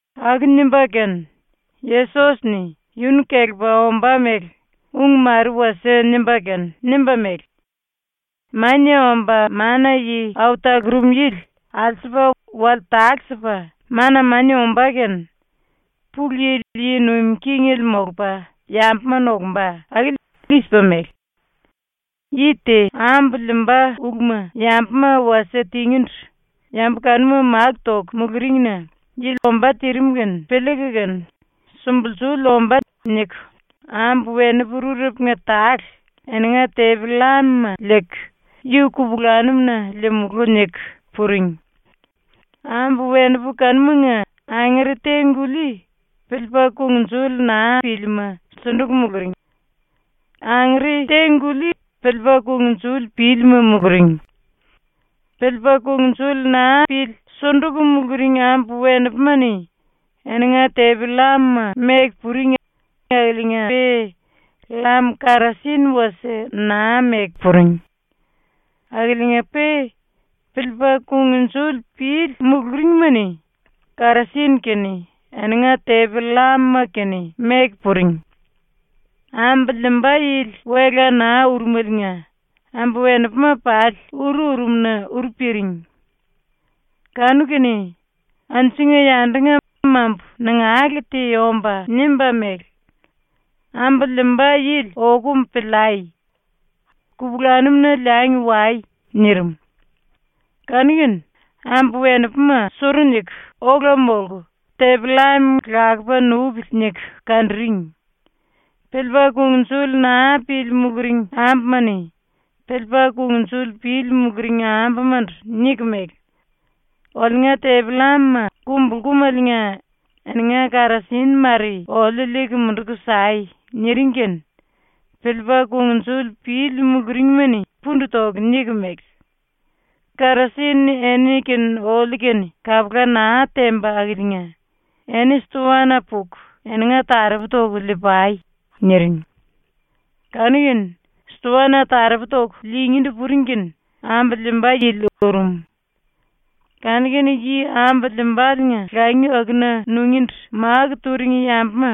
⸤Aku nimba kene, Yesos-ni yunu kelepa ombá mele ung mare wasie nimba kene nimba mele:⸥ “⸤Mania Omba Mana-Yi Au Talurum Yili alsupa wale tale-sipa mana mania ombá kene⸥ Pulu Yili yi nuim kingele molupa yambuma nokumba akili i-sipa mele: “Yi te ambu liimba uluma yambuma wasie tingíndu yambu kanuma máku toku muluringna yili ombá tirim kene piliiku kene ‘Sumbulsuli ombá.’ niku ambu-wenipu rurepunga tale eninga tepi-llamuma liiku “Yu kupulanum-na liimulú.” niku puring. Ambu-wenipu kanumanga angere te-guli piliipa kungnjuli naa pílima sunduku muluring; angere te-guli piliipa kungnjuli pílima muluring. Piliipa kungnjuli naa pili sunduku muluring ambu-wenipuma-ni eninga tepi-llamuma meku puring akiliinga-pe llam karasin wasie naa meku puring. Akiliinga-pe piliipa kungnjuli pili muluringma-ni karasin kene eninga tepi-llamuma kene meku puring. Ambu liimba yili wela naa urumeliinga ambu-wenipuma pali uru urum-na uru piring. Kanu-kene anjunga-yandunga mambu nangale te omba nimba mele: “Ambu liimba yili okum piliai! Kupulanum-na liangi wai!” nirim. Kanu-kene ambu-wenipuma suru niku ola molku tepi-llam ‘Lakupa nupili.’ niku kanduring. Piliipa kungnjuli naa pili muluring ambuma-ni piliipa kungnjuli pili muluring ambumandu niku mele: “Oliunga tepi-llamuma kumbulkumeliinga eninga karasin mare oliu liiku munduku sai.” niring kene piliipa kungnjuli pili muluringma-ni pundu toku niku mele: “Karasin eni kene oliu kene kapula naa temba akiliinga eni stoana puku eninga taropu toku lii-pai.” niring. Kanu-kene stoana taropu toku liingíndu puring kene ambu liimba yili urum. Kanu-kene yi ambu liimbaliinga langi akuna nungíndu máku turing yambuma,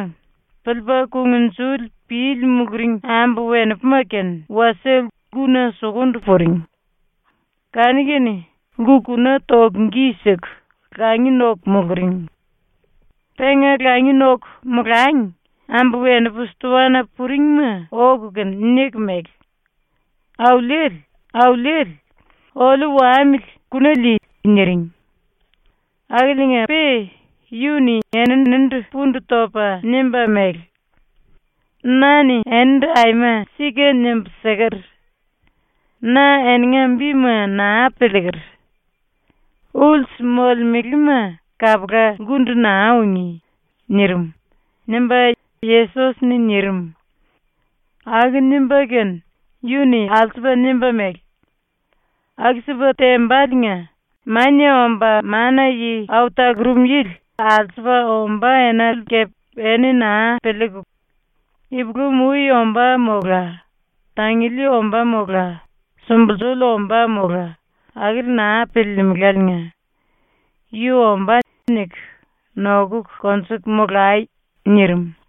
piliipa kungnjuli pili muluring ambu-wenipuma kene wasie lkuna sukundu puring. Kanu-kene lku-kuna toku gi siku langi noku muluring. Penga langi noku molangi ambu-wenipu stoana puringma oku kene niku mele: “Auliele, Auliele, oliu wamili kuna lii.” niring. Akiliinga-pe yu-ni eninindu pundu topa nimba mele: “Na-ni enindu aima sika nimbu siker: Na eninga bima naa piliiker. ⸤Ulsu molemelema kapula lkundu naa ungí.⸥” nirim.” ⸤nimba Yesos-ni nirim.⸥ ⸤Aku nimba kene yu-ni alsupa nimba mele:⸥ “Aku-sipa tembaliinga Mania Omba Mana-Yi Au Talurum Yili alsupa ombá enale kepe eni naa piliiku, ipulam-ui ombá mola tanguli ombá mola, sumbulsuli ombá mola, akili naa piliilimiléliinga ‘yu ombá.’ niku nokuku konjuku molai.” ⸤nirim.⸥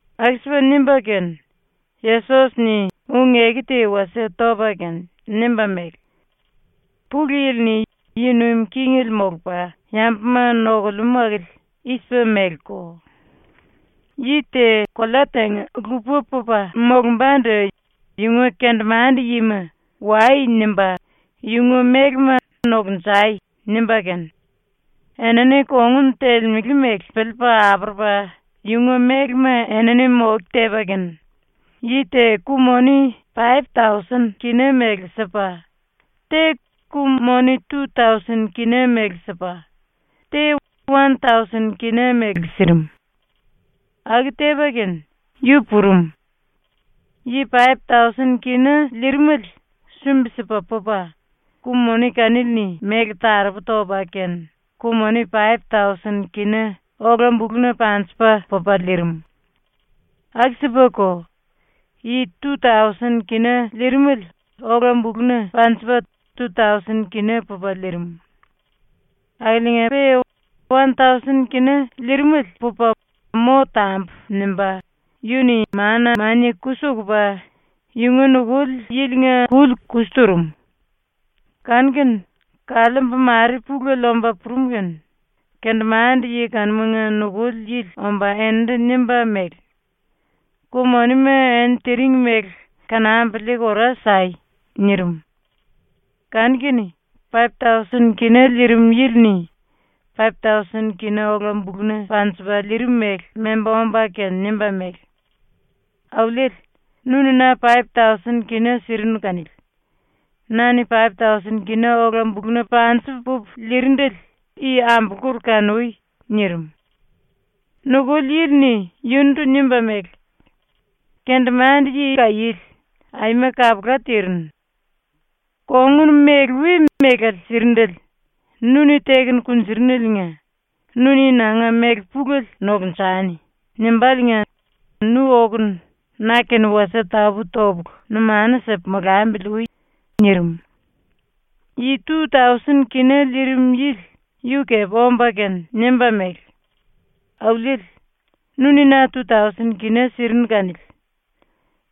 ⸤Aku-sipa nimba kene Yesos-ni ung-eku te wasie topa kene nimba mele:⸥ “⸤Pulu Yili-ni yi nuim kingele molupa yambuma nokulemú akili⸥ i-sipa meleko: “Yi te kolea tenga-lupa pupa molumbandu yunga kendemande-yima “Wai.” nimba yunga mélema “Nokunjai.” nimba kene, enini kongun telemele mele piliipa apurupa yunga mélema enini moke tepa kene yi te ku-moni paip-tausen kina mele sipa, te ku-moni tu-tausen kina mele sipa, te wan-tausen kina mele sirim. Aku tepa kene yu purum. Yi paip-tausen kina liirimele sumbi-sipa pupa ku-moni kanili-ni méle taropu topa kene, ku-moni paip-tausen kina ola-buluna panjipa pupa liirim. Aku-sipako yi tu-tausen kina liirimele ola-buluna panjipa tu-tausen kina pupa liirim. Akiliinga-pe wan-tausen kina liirimele pupa ‘Mo tambu.’ nimba yu-ni mana mania kusi ukupa yunga nukuli yilinga kuli kusi turum. Kanu-kene kaliimbu mare pulele omba purum kene kendemande-yi kanumanga nukuli yili omba eninindu nimba mele: “Ku-monima eni tiring mele kanambu liiku ora sai.” nirim. Kanu-kene paip-tausen kina liirim yili-ni paip-tausen kina ola-buluna panjipa liirimele memba omba kene nimba mele: “Auliele, nu-ni na paip-tausen kina sirinu kanili. Na-ni paip-tausen kina ola-buluna panjipa pupu liirindele i ambulkur kanui.” nirim. Nukuli yili-ni yunundu nimba mele: “Kendemande-yi kaiéle, aima kapula tirinu. Kongun mele-wele mele sirindele nu-ni teku konjuruneliinga “Nu-ni nanga méle pulele nokunjani.” nimbáliinga nu okunu na-kene wasie tapú-topulu numanu sipu molambili ui.” nirim. Yi tu-tausen kina liirim yili yu kepe omba kene nimba mele: “Auliele, nu-ni na tu-tausen kina sirinu kanili.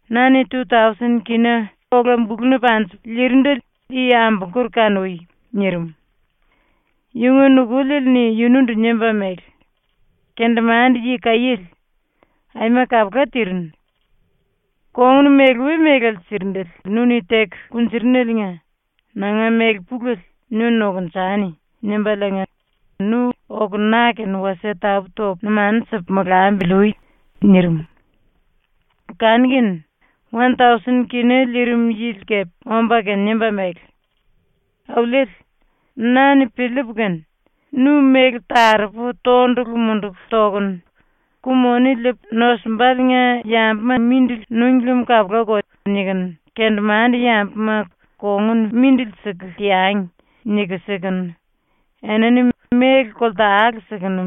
Na-ni tu-tausen kina ola-buluna panjipu liirindele i ambulkur kanui.” nirim. Yunga nukuliele-ni yunundu nimba mele: “Kendemande-yi kaiéle, aima kapula tirinu. Kongun mele-wele mele sirindele nu-ni teku konjuruneliinga nanga méle pulele “Nu nokunjani.” nimbáliinga nu oku na-kene wasie tapú-topu numanu sipu molambili ui.” nirim. Kanu-kene wan-tausen kina liirim yili kepe omba kene nimba mele: “Auliele, na-ni piliipu kene, ‘Nu méle taropu tondulu munduku tokunu ‘Ku-moni liipu nosumbaliinga yambuma mindili núngi lem kapulako.’ nikunu ⸤kendemande-yambuma ‘Kongun mindili siku teangi.’ niku sikunu, enini méle koltale sikunu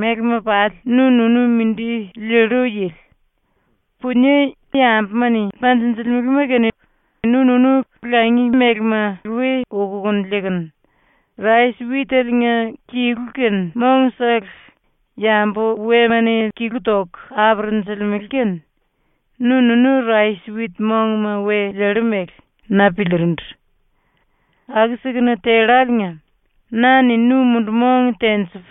mélema pali nu-nunu mindi liillu yili;⸥ punie yambuma-ni panjinjilimele kene nu-nunu langi mélema we ukuku liikunu; rais-witeliinga kilu kene mongsele yambu wema-ni kilu toku apurunjulimele kene nu-nunu rais-wit mongma we liillu mele.’ na piliirindu. ⸤Aku-sikunu telláliinga⸥ na-ni nu mundu-mong tenjipu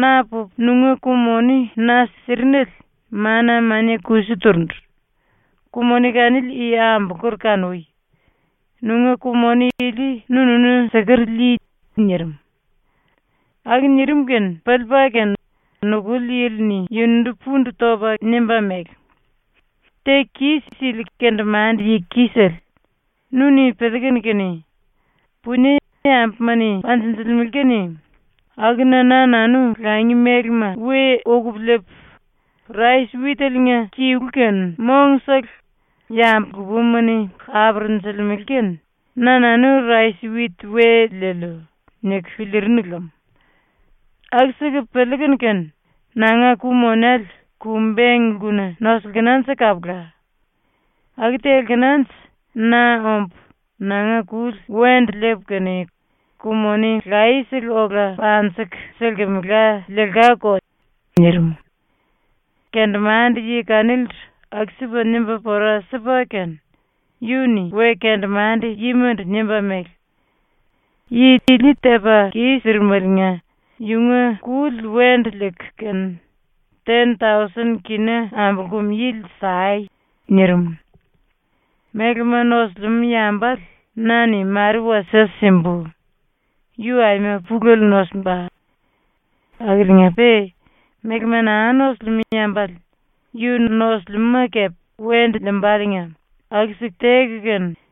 na pupu nunga ku-moni na sirinele mana mania kusi turundu. Ku-moni kanili i ambulkur kanui. Nunga ku-moni ili nunu siker lii.” nirim. Aku nirim kene piliipa kene nukuli yili-ni yunundu pundu topa nimba mele: “Teku kis-sili kendemande-yi kisele, nu-ni piliikunu kene, ‘Punie yambuma-ni panjinjilimele kene akuna na-nanu langi mélema we ukupu liipu; rais-witeliinga kilu kene mongsele yambu lupama-ni apurunjulimele kene na-nanu rais-wit we liiliu.’ niku piliirinu lem. Aku-siku piliikunu kene nanga ku-monele ku-beng lkuna nosilkinanje kapula. Aku telkenanje na ombu nanga kuli wendu liipu kene ku-moni laye-sele ola panjiku silkimela liilkáko.” ⸤nirim.⸥ ⸤Kendemande-yi kanilindu aku-sipa nimba pora sipa kene yu-ni we-kendemande-yimandu nimba mele:⸥ “Yi ili tepa kis-sirimeliinga yunga kuli wendu liiku kene ten-tausen kina ambulkum yili sai.” ⸤nirim.⸥ “Mélema nosilimú yambale na-ni mare wasie simbu, yu aima pulele nosimba. Akiliinga-pe mélema naa nosilimú yambale yu nosilimúma kepe wendu liimbáliinga aku-siku teku kene,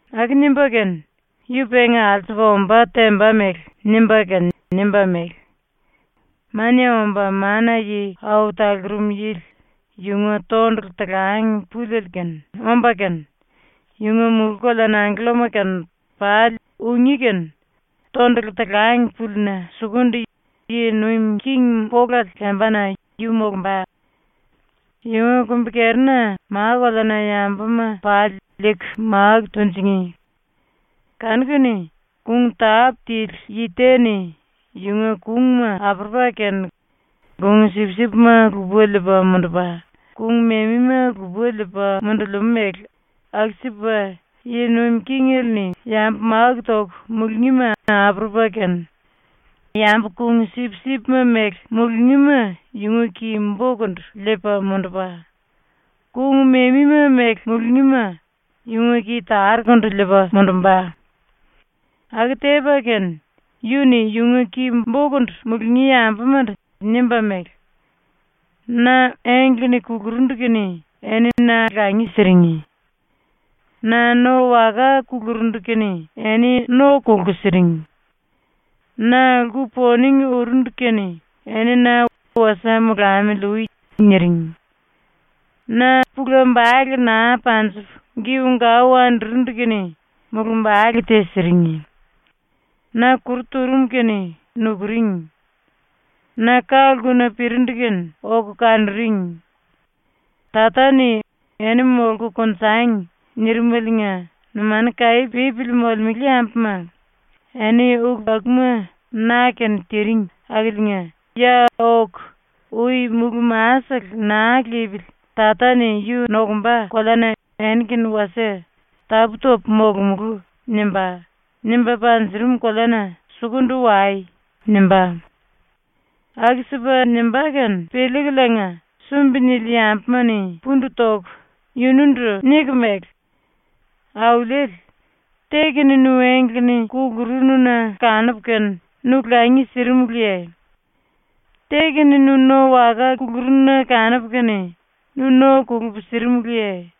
⸤Aku nimba kene yu penga alsupa omba temba mele nimba kene nimba mele:⸥ “Mania Omba Mana-Yi Au Talurum Yili yunga tondulu talang puliele-kene omba kene, yunga mulú-koleana angkellama-kene pali ungí kene tondulu talang púlina sukundu yi nuim king polale lembana yu molumba. Yunga kumbi-kerina ma-koleana yambuma pali liiku máku tunjingí. Kanu-kene kung tápu tili yi te-ni yunga kungma apurupa kene kung-sipsipma lupa liipa mundupa, kung-memima lupa liipa mundulimú mele aku-sipa Yi Nuim Kingele-ni yambu máku toku mulungíma apurupa kene, yambu kung-sipsipma mele mulungíma yunga ki-bokundu liipa mundupa, kung-memima mele mulungíma yunga ki-tarukundu liipa mundumba. Aku tepa kene, yu-ni yunga ki-bokundu mulungí yambumandu nimba mele: “Na engle-ni kulurundu kene eni na langi siring. Na no waka kulurundu kene eni no kolku siring. Na lku-poning urundu kene eni na “Wasie molamili ui.” niring. Na púla-bale naa panjipu giu-gau andurundu kene mulumbale te siring. Na kuru turum kene nukuring. Na ka-lkuna pirindu kene oku kanuring. Tata-ni ‘Eni molku konjangi.’ nirimeliinga numanu kaí pípili molemele yambuma, eni ulu akuma na-kene tiring akiliinga, ya oku, ui mulú-masele naa lipili Tata-ni yu nokumba koleana eni-kene wasie ‘Tapú-topu molomulú.’ nimba, nimba panjurum koleana sukundu wai.” nimbá. Aku-sipa nimbá kene piliikuliinga sumbi-nili yambuma-ni pundu toku yunundu niku mele: “Auliele, te-kene nu engle-ni kulurunu-na kanupu kene nu langi sirimuluye? Te-kene nu no waka kulurunu-na kanupu kene nu no kolupu sirimuluye?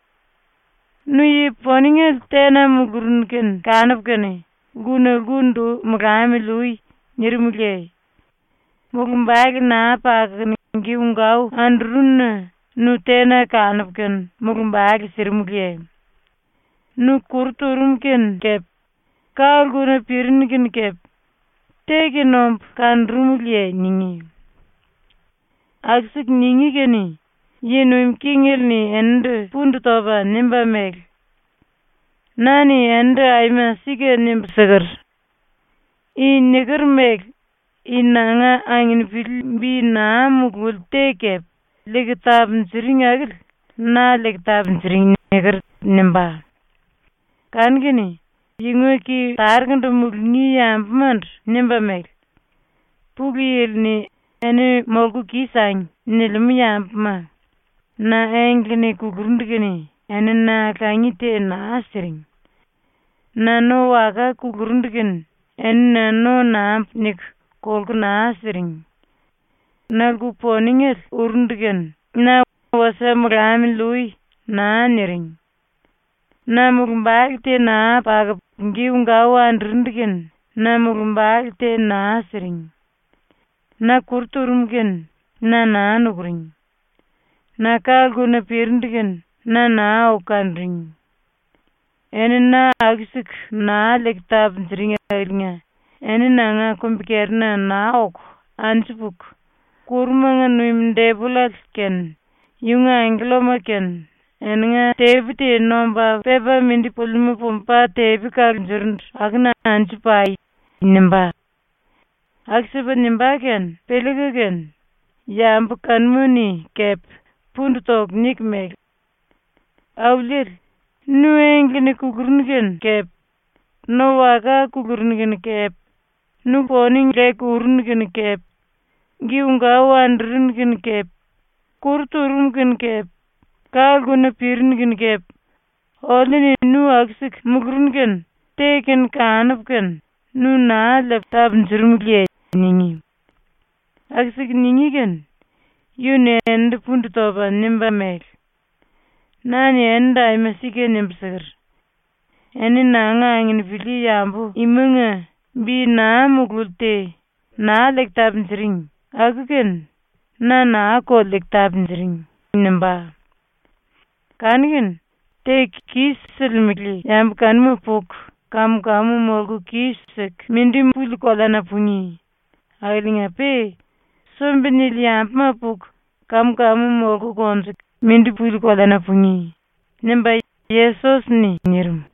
Nu yi-poningele tena mulurunu kene kanupu kene “Lkuna lkundu molamili ui.” nirimuluye? Mulumbale naa pakukunu giu-gau andurunu-na nu tena kanupu kene mulumbale sirimuluye? Nu kuru turum kene kepe, ka-lkuna pirinu kene kepe, te-kene ombu kanurumuluye?” ningí. ⸤Aku-siku ningí kene⸥ Yi Nuim Kingele-ni eninindu pundu topa nimba mele: “Na-ni enindu aima sika nimbu siker: “I niker mele i nanga anginipili bi naa mululi te kepe liiku tapunjuring akili na liiku tapunjuring.” niker.” nimbá. Kanu-kene yunga ki-tarukundu mulungí yambumandu nimba mele: “Pulu Yili-ni ‘Eni molku kis-sangi.’ nilimú yambuma, na engle-ni kulurundu kene eni na langi te naa siring. Na no waka kulurundu kene eni na ‘no nambu.’ niku kolku naa siring. Na lku-poningele urundu kene na “Wasie molamili ui.” naa niring. Na mulumbale te naa pakupu giu-gau andurundu kene na mulumbale te naa siring. Na kuru turum kene na naa nukuring. Na ka-lkuna pirindu kene na naa oku kanuring. ⸤Eni na aku-siku naa liiku tapunjuring⸥ akiliinga eni nanga kumbi-kerina naa oku anju puku, ⸤kurumanga nuim⸥ depollale kene yunga angkellama kene eninga tepi te nomba pepa mindi pulimú pumba tepi kalunjurundu akuna anju pai.” nimbá. Aku-sipa nimbá kene piliiku kene yambu kanuma-ni kepe pundu toku niku mele: “Auliele, nu engle-ni kulurunu kene kepe, no waka kulurunu kene kepe, nu poning leku urunu kene kepe, giu-gau andurunu kene kepe, kuru turum kene kepe, ka-lkuna pirinu kene kepe, oliu-ni nu aku-siku mulurunu kene te-kene kanupu kene nu naa liipu tapunjurumuluye?” ningí. ⸤Aku-siku ningí kene⸥ yu-ni eninindu pundu topa nimba mele: “Na-ni enindu aima sika nimbu siker: Eni nanga anginipili yambu imanga bi naa mululi te naa liiku tapunjuring aku-kene na naa-ko liiku tapunjuring.” nimbá. “Kanu-kene ⸤teku kis-silimele⸥ yambu kanuma puku kam-kamu molku kis-siku mindi puli koleana pungí, akiliinga-pe sumbi-nili yambuma puku kam-kamu molku konjuku mindi puli koleana pungí.” ⸤nimba Yesos-ni⸥ nirim.